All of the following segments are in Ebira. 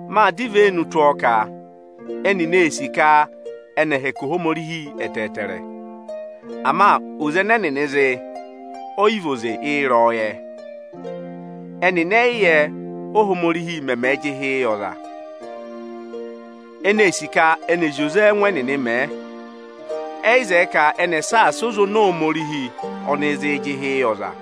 Mâ dọ ivenu tụ́ ọọ ka ẹnịnị ee sì ka ẹnị ẹ̀ẹ hẹkẹ Ohomorihi ẹtẹẹtẹrẹ. Ama oze ẹnẹ ẹnịnị zị, ọ yị vị oze ịrẹyọyẹ. Ẹnịnị ẹ yị yẹ, Óhomorihi mẹmẹẹ̄ jị ịhị yị ọza. Ẹnị ee sì ka ẹnị ẹ̀ zị oze ẹ́ẹngụ ẹnịnị mẹẹ. Ẹ yị zẹẹ ka ẹnị ẹ̀ saasa oze oni Ohomorihi ọnịị̄ zịị jị ịhị yị ọza.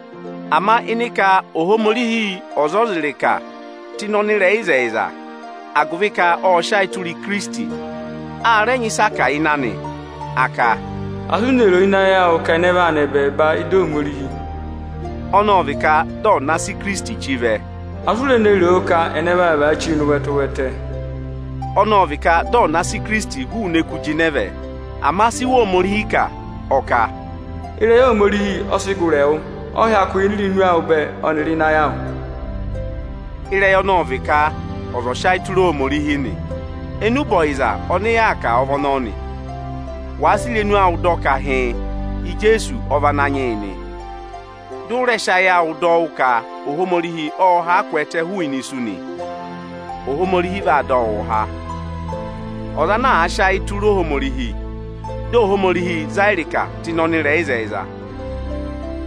Ama ịnị ka Ohomorihi ọ̀ za ọza ịrịka tụ́ ịnị ọnịrẹyịzẹyịza, agụvị ka ộ sị ayị tụra Ikirisiti, a rẹ nyị ịsị a kà ịnị anị. A ka, “Asị u ne roo ịnị ayị awụ ka ẹnẹ vaa nọ ẹbẹẹba ịda Ohomorihi?” (Ọnọọ vị ka dị ọ̀ na sị Ikirisiti chí vẹ.) Asị u re ne roo ka ẹnẹ vaa vaa chíi nọ ụvẹtẹ? (Ọnọọ vị ka dị ọ̀ na sị Ikirisiti hụụnị eku jịnẹ vẹ.) Ama si Iwe Ohomorihi kà? Ọ kà, “Ịrẹyị Ohomorihi ọ sị gụrị ẹwụ, ọ hyakụ yà ini irenu awụ bẹẹ ọnịrị ịnị ayị awụ.” Ịrẹyị ọnọọ ọ vị ka ọza ọ̀ sị ayị tụra Ohomorihi nị. Enube ọyịza ọnị yaa kà ọ vị ọnọọ nị. Wàa sị irenu awụ dọ ka hịịn, Ijeesu ọ vị Ananyị yị nị, dị ụ rẹ sị ayị awụ dọ wụ́ ka Ohomorihi ộ haa kwẹẹtẹ hụụnị isu nị, Ohomorihi vaa dọ wụụ há. Ọza ana àa sị ayị anị tụra Ohomorihi, dị Ohomorihi zaa ịrịka tụ́ ịnị ọnịrẹyịzẹyịza.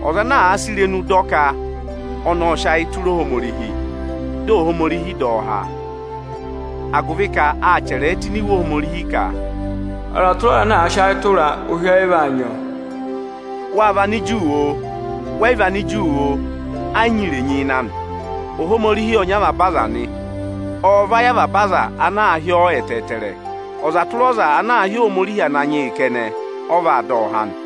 Ọza ana àa sị irenu dọ ka ọnị ộ sị ayị tụra Ohomorihi, dị Ohomorihi dọ ọ há. Agụvị ka â chẹrẹẹ tụ́ ini Iwe Ohomorihi ka, “Ọza tụra ọza ana àa sị ayị tụraa, ụhị ọyị vaa nyị ọọ.” Wâ vị Aniju oo, wẹ yị vị Aniju oo, ẹ yị nyị irenyi ịnị anị. Ohomorihi ọ nyị avaba aza nị. Ọọ̄ vayị avaba aza ana àa hị́ ọọ ẹtẹẹtẹrẹ. Ọza tụra ọza ana àa hị́ Ohomorihi Ananyị yị kẹnẹ, ọ vaa dọ ọ há nị.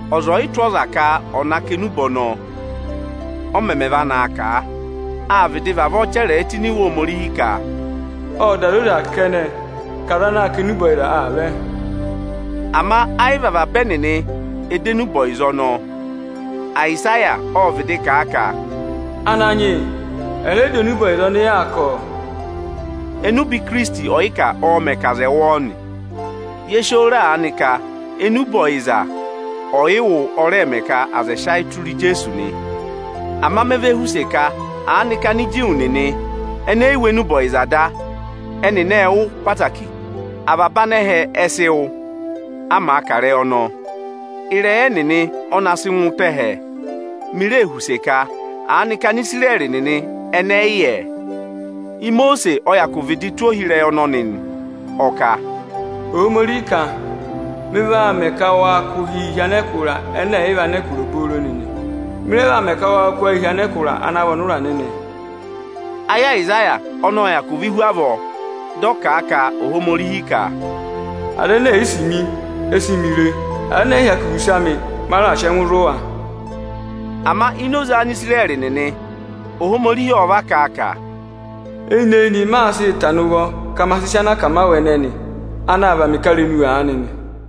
Ọza ọ̀ yị tụ́ ọza ka ọ̀ na kà enube ọnọọ, ọ mẹmẹ va naa kà a? Â vịdị vavọọ chẹrẹẹ tụ́ ini Iwe Ohomorihi ka, “Ọọ da zoza kẹnẹ ka aza anaā kà enube ọyịza aa vẹ.” Ama ayị vị avaba ẹnịnị ẹ dọ enube ọyịza ọnọọ. Ayịsaya ộ vịdị kà a ka, “Ananyị yị, aza ẹ yị dọ enube ọyịza ọnị yaa kà, ọ!” Enube Ikirisiti ọyịkà ọọ̄ mẹ̀ ka aza ẹ̀ wụ́ ọọ nị. Ye si oo re aanị ka enube ọyịza ọyịwụ ọ rẹẹ̄ mẹ ka aza ẹ̀ sị ayị tụra Ijeesu nị. Ama me ve họ̀ use ka aanị ka Aniju nịnị è yị wụ́ enube ọyịza da? Ẹnịnị ệ wụ́ ẹtẹẹtẹrẹ. Avaba anẹhẹ ẹ sị wụ́, a màa kà ịrẹyị ọnọọ. Ịrẹyị ẹnịnị ọ na sị ngụ avaba ẹhẹ. Mi ree họ̀ use ka, aanị ka Anisirẹrị ẹnị ẹ yị yẹ? Imosiisi ọ hyakụ vịdị tụ́ ohi ịrẹyị ọnọnị nị. Ọ kà Ohomorihi kà, “Mị vaa mẹ ka waa kụ̀ ụhịị hi anẹkụra ẹnẹ ẹ̀ yị vị anẹkụra obooro nịnị. Mị rẹ vaa mẹ ka waa kụ́ ayịị hi anẹkụra ana vị ọnụra nịnị.” Ayị Ayịsaya ọnị ộ hyakụ vị́ hu avọọ, dị ọ kà a ka Ohomorihi ka, “Aza ene è yi sì mi, e si mi re. Aza ẹnẹ ẹ̀ yị hyakụ họ̀ use amị, ma raà sị ẹngụ zụ̀ wa.” Ama ini oze Anisirẹrị nịnị Ohomorihi ọ va kà a ka, “Eyinị-eyinị maa sịị tana ụvọ ka ma sị sị anakamawụ ẹnẹnị, anaā và mị ị̀karenu aanị nị.”